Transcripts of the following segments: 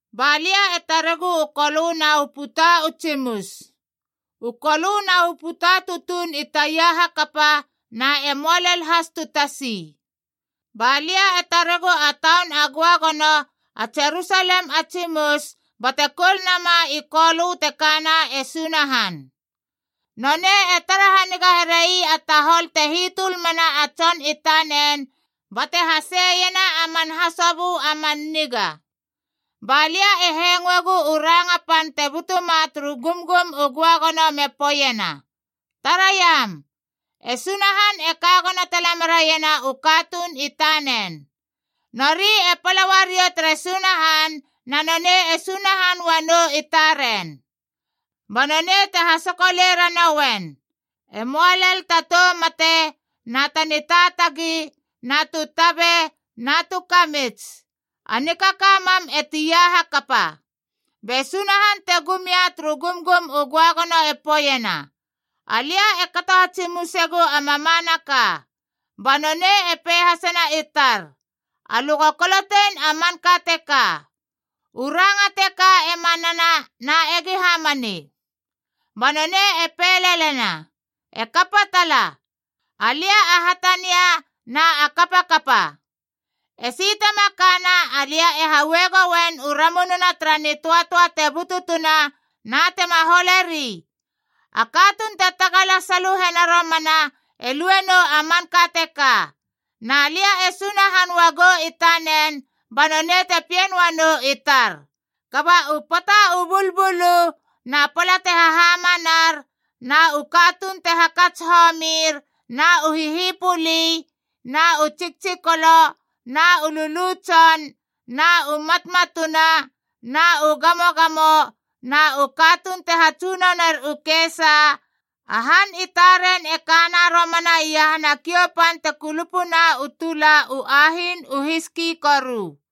Ba lia e taregu u kolö na u puta u tsimus. U kolö na u puta tutuun i tia hakapa, na e möa lel has tu tasi. Ba lia e taregu a Taun a Göagono, a Jerusalem a tsimus, bate koul nama i Kolö te kana e Sunahan. Nonei e tara haniga here ii a tahol te hitöl mena a tson i tanen bate haseiena a man hasobö a man niga. Ba lia e hengoegu u ranga pan te butuma turu gumgum u göagono me poeiena, “Tara iam. E Sunahan e ka gono tala meraiena u katuun i tanen. Nori e pala uariou tere Sunahan na nonei e Sunahan uanou i taren. Ba nonei te hasokolei ranouen. E möa lel ta tou mate na ta nitaatagi na tu tabe na tu kamits. A nikaka mam e tia hakapa.” Be Sunahan te gum ia turu gumgum u göagono e poeiena, “Alia e kato hatsimusegu a mamanaka.” Ba nonei e pei hasena i tar, “Alö go kolotein a manka teka. U ranga teka e manana na egi hamani.” Ba nonei e pei lelena, “E kapa tala! Alia a Hatania na a Kapakapa.a Esi te makana alia e haue gouen u ramununa tara nitöatöa te bututuna na tema holeri. A katuun te tagala saluhena romana e lue nou a manka teka. Na alia e Sunahan uagou i tanen ba nonei te pien uanou i tar. Kaba u pata bulbulu, na pala te hahamanar, na u katuun te hakats homir, na u hihipuli, na u tsiktsikolo na u lulu tson, na u matmatuna, na u gamogamo na u katuun te hatsunoner u kesa, a han i taren e kana romana iahana kiou pan te kulupuna u tula u ahiin u hiski koru.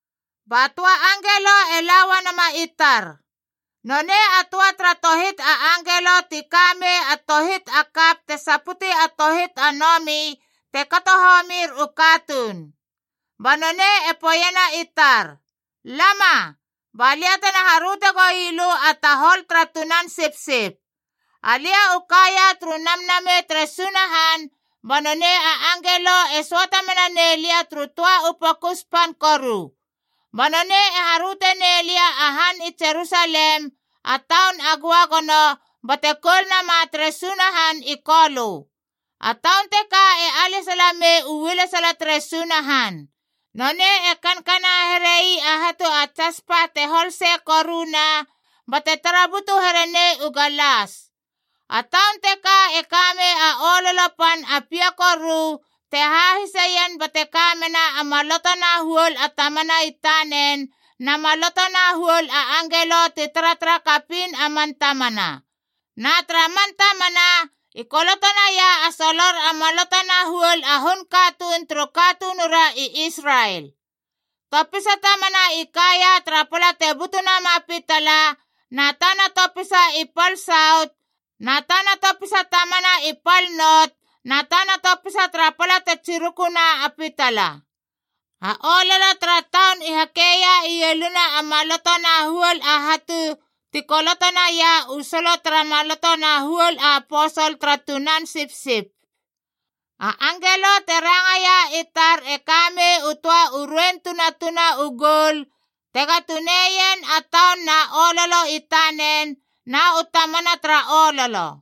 Ba töa angelo e la uanama i tar. Nonei a töa tara tohit a angelo ti ka mei a tohit a kap te saputi a tohit a nomi te kato homir u katuun. Ba nonei e poeiena i tar, “Lama, balia tena haröte goilö a Tahol tara Tunan Sipsip.” Alia u kaia turu Namnamei tere Sunahan, ba nonei a angelo e söata mena nei lia turu töa u pokus pan koru. Ba nonei e haröte nei lia a han i Jerusalem, a Taun a Göagono, bate koul nama tere Sunahan i Kolö. A taun teka e alesala mei u ualesala tere Sunahan. Nonei e kankanaha here ii a hatu a tsaspa te hol sei koruna bate tara butu here nei u galas. A taun teka e ka mei a ololo pan a pia koru te hahiseien bate ka mena a maloto na huol a tamana i tanen, na maloto na huol a angelo ti taratara kapiin a man tamana. Na tara man tamana i koloto naia a solor a maloto na huol a hun katuun turu katunura i Israel. Topisa tamana i kaia tara pala te butu nama a pitala, na tana topisa i pal Saut, na tana topisa tamana i pal Not, na tana topisa tara pala te tsirukuna a pitala. A ololo tara taun i hatakeia ieluna a maloto na huol a hatu ti koloto naia u solo tara maloto na huol a aposol tara Tunan Sipsip. A angelo te ranga ia i tar e ka mei u töa u ruein tunatuna u goul tega tuneien a taun na ololo i tanen na u tamana tara ololo.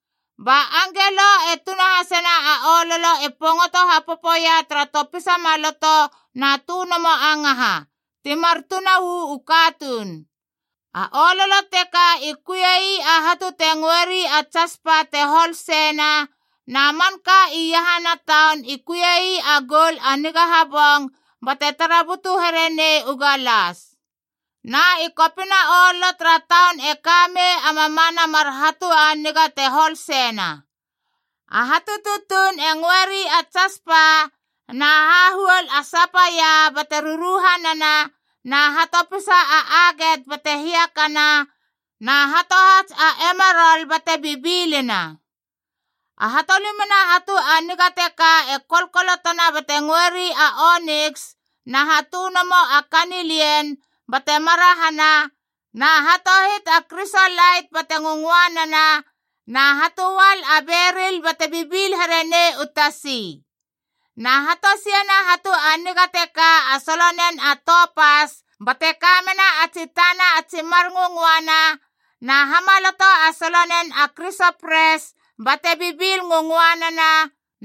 Ba angelo e tuna hasena a ololo e pongotoc hapopoia tara topisa maloto na tönomo a ngaha, ti mar tuna uu katuun. A ololo teka i kuie ii a hatu te ngöeri a tsaspa te hol seina, na manka iahana taun i kuie ii a goul a niga habong bate tara butu here nei u galas. Na i kopina ololo tara taun e ka mei a mamana mar hatu a niga te hol seina.d A hatu tutuun e ngöeri a tsaspa, na hahuol a sapaia bate ruruhanana, na hatopisa a aget bate hiakana, na hatohats a emeral bate bibilina. A hatolimana hatu a niga teka e kolkolotona bate ngöeri a oniks, na hatönomo a kanilian bate mararana, na hatohit a krisolait bate ngöngöanana, na hatöal a beril bate bibil here nei u tasi. Na hatosiena hatu a niga teka a solonen a topas bate ka mena a tsi tana a tsi mar ngöngöana, na hamaloto a solonen a krisopres bate bibil ngöngöanana,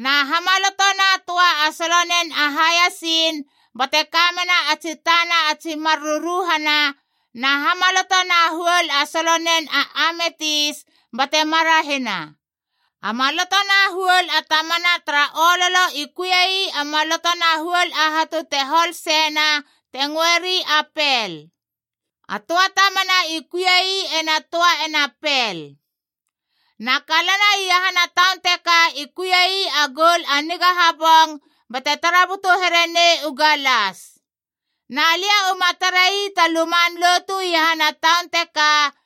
na hamaloto na töa a solonen a haiasin bate ka mena a tsi tana a tsi mar ruruhana, na hamaloto na huol a solonen a ametis bate marahina. A maloto na huol a tamana tara ololo i kuie ii a maloto na huol a hatu te hol seina te ngöeri a pel.e A töa tamana i kuie ii ena töa ena pel. Na kalana iahana taun teka i kuie ii a goul a niga habong bate tara butu here nei u galas. Na lia uma tare ii ta luman lotu iahana taun teka,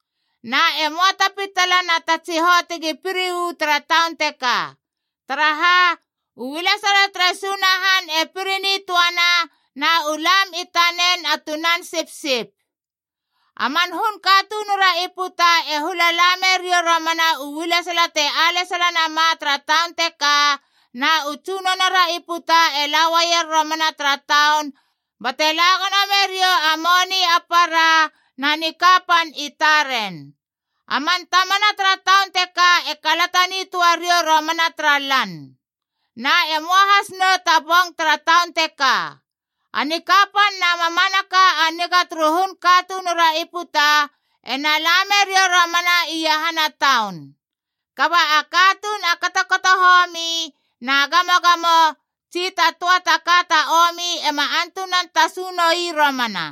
Na e möa ta pitala na ta tsihou tegi piri uu tara taun teka. Taraha? U ualesala tere Sunahan e piri nitöana, na u lam i tanen a Tunan Sipsip. A man hun katunura i puta e hula la meriou romana u ualesala te alesala nama tara taun teka, na u tsunonora i puta e la uaier romana tara taun bate la gono meriou a moni a para na nikapan i taren. A man tamana tara taun teka e kalata nitöa riou romana tara lan. Na e möa has nou ta bong tara taun teka. A nikapan na mamanaka a niga turu hun katunura i puta ena la meriou romana iahana a taun. Kaba a katuun a katokato homi na gamogamo tsi ta töa ta ka ta omi ema antunan tasu noi romana.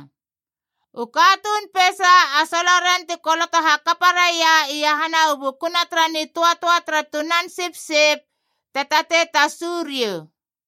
U katuun peisa a soloren ti koloto hakapa raia iahana u bukuna tara nitöatöa tara Tunan Sipsip te tatei tasu riou.